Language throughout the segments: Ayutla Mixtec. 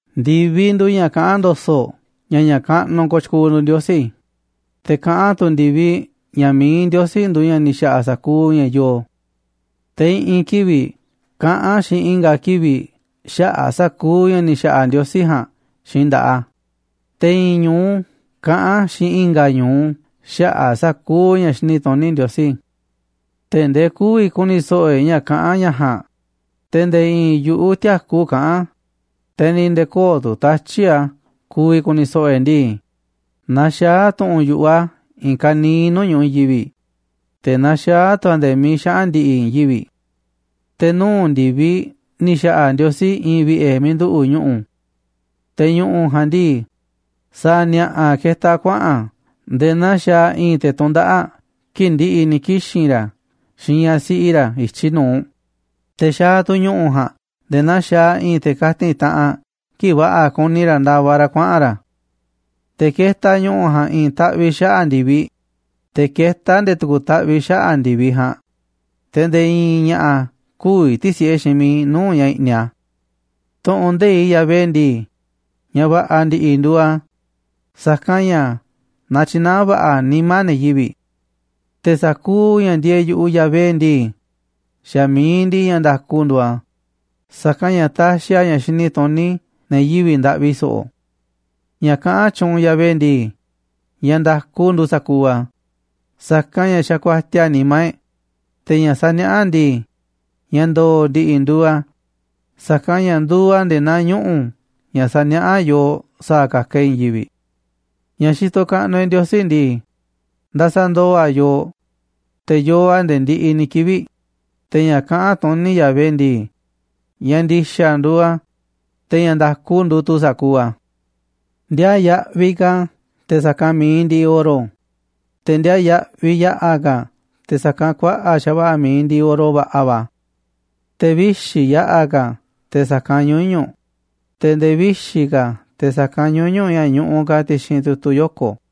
Ndi̱viꞌ nduuꞌ ña̱ kaꞌán ndo̱so̱ꞌ ña̱ ña̱ kaꞌnuꞌ kooꞌ tyukuuꞌ nduuꞌ Ndiosí, te̱ kaꞌán tu̱ ndi̱viꞌ ña̱ mi̱iꞌ Ndiosí nduuꞌ ña̱ ni̱ xa̱ꞌa̱ sa̱kuuꞌ ña̱ yooꞌ. Te̱ i̱ꞌi̱n kivi̱ꞌ kaꞌán xiinꞌ i̱nga̱ kivi̱ꞌ xaꞌa̱ꞌ sa̱kuuꞌ ña̱ ni̱ xa̱ꞌa̱ Ndiosí ja̱a̱nꞌ xiinꞌ nda̱ꞌaꞌ a̱, te̱ i̱ꞌi̱n ñu̱u kaꞌán xiinꞌ i̱nga̱ ñu̱u xaꞌa̱ꞌ sa̱kuuꞌ ña̱ xini tuní Ndiosí. Tee̱ꞌ ndee kü̱vi̱ ku̱ni̱ so̱ꞌo̱ e̱ꞌ ña̱ kaꞌán ña̱ ja̱a̱nꞌ, te̱ nde̱e̱ i̱i̱n yu̱ꞌuꞌ tïakú kaꞌán a̱, te̱ ni̱ nde̱e̱ köo̱ꞌ tu̱ tatyi̱ꞌ a̱ ku̱vi̱ ku̱ni̱ so̱ꞌo̱ e̱ꞌ ndii. Naxaá tu̱ꞌu̱n yu̱ꞌuꞌ a̱ i̱i̱n ka̱niiꞌ nuu̱ꞌ ñu̱ꞌuꞌ i̱i̱n yivi̱ꞌ, te̱ naxaá tu̱ a̱ nde̱e̱ miiꞌ xaꞌa̱n ndi̱ꞌi̱ i̱i̱n yivi̱ꞌ. Te̱ nuu̱ꞌ ndi̱viꞌ ni̱ xa̱ꞌa̱ Ndiosí i̱i̱n vi̱ꞌe̱ miiꞌ nduꞌu̱ꞌ ñu̱ꞌu̱. Te̱ ñu̱ꞌu̱ ja̱a̱nꞌ ndii, sa̱a̱ ni̱a̱ꞌa̱ ketaꞌ a̱ kuaꞌa̱n a̱ nde̱e̱ naa xaaꞌ i̱i̱n te̱ tundaꞌáꞌ kii̱ꞌ ndi̱ꞌi̱ ni̱ kixi̱n ra̱ xiinꞌ ñaꞌ siꞌi ra̱ i̱tyiꞌ nu̱uꞌ, te̱ xaaꞌ tu̱ ñu̱ꞌu̱ ja̱a̱nꞌ nde̱e̱ naa i̱i̱n te̱ kati̱n taꞌanꞌ kii̱ꞌ va̱ꞌa̱ kuni ra̱ ndavaꞌ ra̱ kuaꞌa̱n ra̱. Te̱ ketaꞌ ñu̱ꞌu̱ ja̱a̱nꞌ i̱i̱n taꞌviꞌ xaꞌa̱ꞌ ndi̱viꞌ, te̱ ketá a̱ nde̱e̱ tu̱ku̱ taꞌviꞌ xaꞌa̱ꞌ ndi̱viꞌ ja̱a̱nꞌ, te̱ nde̱e̱ i̱i̱n ña̱ꞌa̱ kü̱vi̱ ti̱si̱ꞌe xiinꞌ miiꞌ nuu̱ꞌ ña̱ i̱ꞌniꞌ a̱. Tu̱ꞌu̱n nde̱iꞌ Yahvé ndii, ña̱ va̱ꞌa̱ ndi̱ꞌi̱ nduuꞌ a̱, sa̱kanꞌ ña̱ natyinaá a̱ va̱ꞌa̱ nimá ne̱ yivi̱ꞌ. Te̱ sa̱kuuꞌ ña̱ ndieeꞌ yu̱ꞌuꞌ Yahvé ndii, xa̱ mi̱iꞌ ndiꞌiꞌ ña̱ nda̱ku nduuꞌ a̱, sa̱kanꞌ ña̱ taxiꞌ a̱ ña̱ xini tuní ne̱ yivi̱ꞌ ndaꞌvi so̱ꞌo̱. Ña̱ kaꞌán tyuunꞌ Yahvé ndii, ña̱ nda̱ku nduuꞌ sa̱kuuꞌ a̱, sa̱kanꞌ ña̱ xa̱ kuatiaꞌ nimá e̱ꞌ. Te̱ ña̱ saniaꞌá a̱ ndii, ña̱ ndo̱o̱ ndi̱ꞌi̱ nduuꞌ a̱, sa̱kanꞌ ña̱ nduuꞌ a̱ nde̱e̱ naa ñuꞌu̱ ña̱ saniaꞌá yooꞌ sa̱a̱ ka̱ka̱ e̱ꞌ i̱i̱n yivi̱ꞌ. Ña̱ xitoꞌ kaꞌnuꞌ e̱ꞌ Ndiosí ndii, ndasaꞌ ndooꞌ a̱ yooꞌ, te̱ yoo a̱ nde̱e̱ ndiꞌiꞌ ni̱ kivi̱ꞌ, te̱ ña̱ kaꞌán tuní Yahvé ndii, ña̱ ndi̱xa̱ nduuꞌ a̱, te̱ ña̱ nda̱ku nduuꞌ tu̱ sa̱kuuꞌ a̱. Ndiaa yaꞌviꞌ ka̱ a̱ te̱ sa̱kanꞌ mi̱iꞌ ndiꞌiꞌ oro, te̱ ndiaa yaꞌviꞌ yaꞌa̱ ka̱ a̱ te̱ sa̱kanꞌ kuaꞌa̱ꞌ xa̱va̱ꞌa̱ mi̱iꞌ ndiꞌiꞌ oro va̱ꞌa̱ va̱. Te̱ vixi̱ yaꞌa̱ ka̱ a̱ te̱ sa̱kanꞌ ñuñu̱ꞌ, te̱ nde̱e̱ vixi̱ ka̱ a̱ te̱ sa̱kanꞌ ñuñu̱ꞌ ña̱ ñuꞌuꞌ ka̱ ti̱xi̱n tu̱tu̱ yoko̱.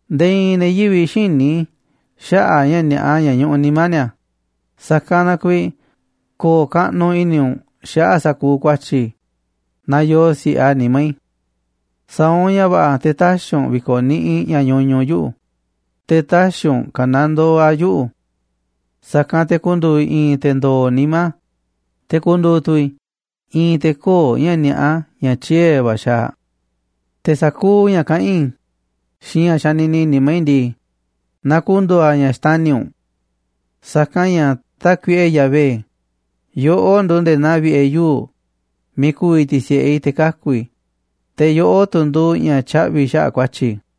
Nde̱e̱ i̱i̱n ne̱ yivi̱ꞌ xïní xaꞌa̱ꞌ ña̱ ni̱a̱ꞌa ña̱ ñuꞌuꞌ nimá ni̱a̱, sa̱kanꞌ na kuiiꞌ ko̱o̱ kaꞌnuꞌ i̱ni̱ u̱nꞌ xaꞌa̱ꞌ sa̱kuuꞌ ku̱a̱tyi̱ i̱ naaꞌ yoo si̱ꞌe a̱ nimá i̱. Sa̱a̱ u̱nꞌ ña̱ va̱ꞌa̱ te̱ tä̱xi̱ u̱nꞌ vi̱ko̱niꞌiꞌ ña̱ ñuñuꞌ yuꞌu̱, te̱ tä̱xi̱ u̱nꞌ ka̱nandoo a̱ yuꞌu̱. Sa̱kanꞌ te̱ ku̱ndu̱u̱ i̱ i̱i̱n te̱ ndo̱o̱ nimá, te̱ ku̱ndu̱u̱ tu̱ i̱ i̱i̱n te̱ köo̱ꞌ ña̱ ni̱a̱ꞌa ña̱ tyiee̱ va̱ xaaꞌ. Te̱ sa̱kuuꞌ ña̱ kaꞌán i̱ xiinꞌ ña̱ xanini nimá i̱ ndii, na ku̱ndu̱u̱ a̱ ña̱ xtani̱ u̱nꞌ. Sa̱kanꞌ ña̱, Tákuiꞌe Yahvé, yoꞌó nduuꞌ nde̱e̱ naa vi̱ꞌe̱ yuu̱ꞌ miiꞌ ku̱vi̱ ti̱si̱ꞌe i̱ te̱ kaku̱ i̱, te̱ yoꞌó tu̱ nduuꞌ ña̱ tyaꞌvi̱ xaꞌa̱ꞌ ku̱a̱tyi̱ i̱.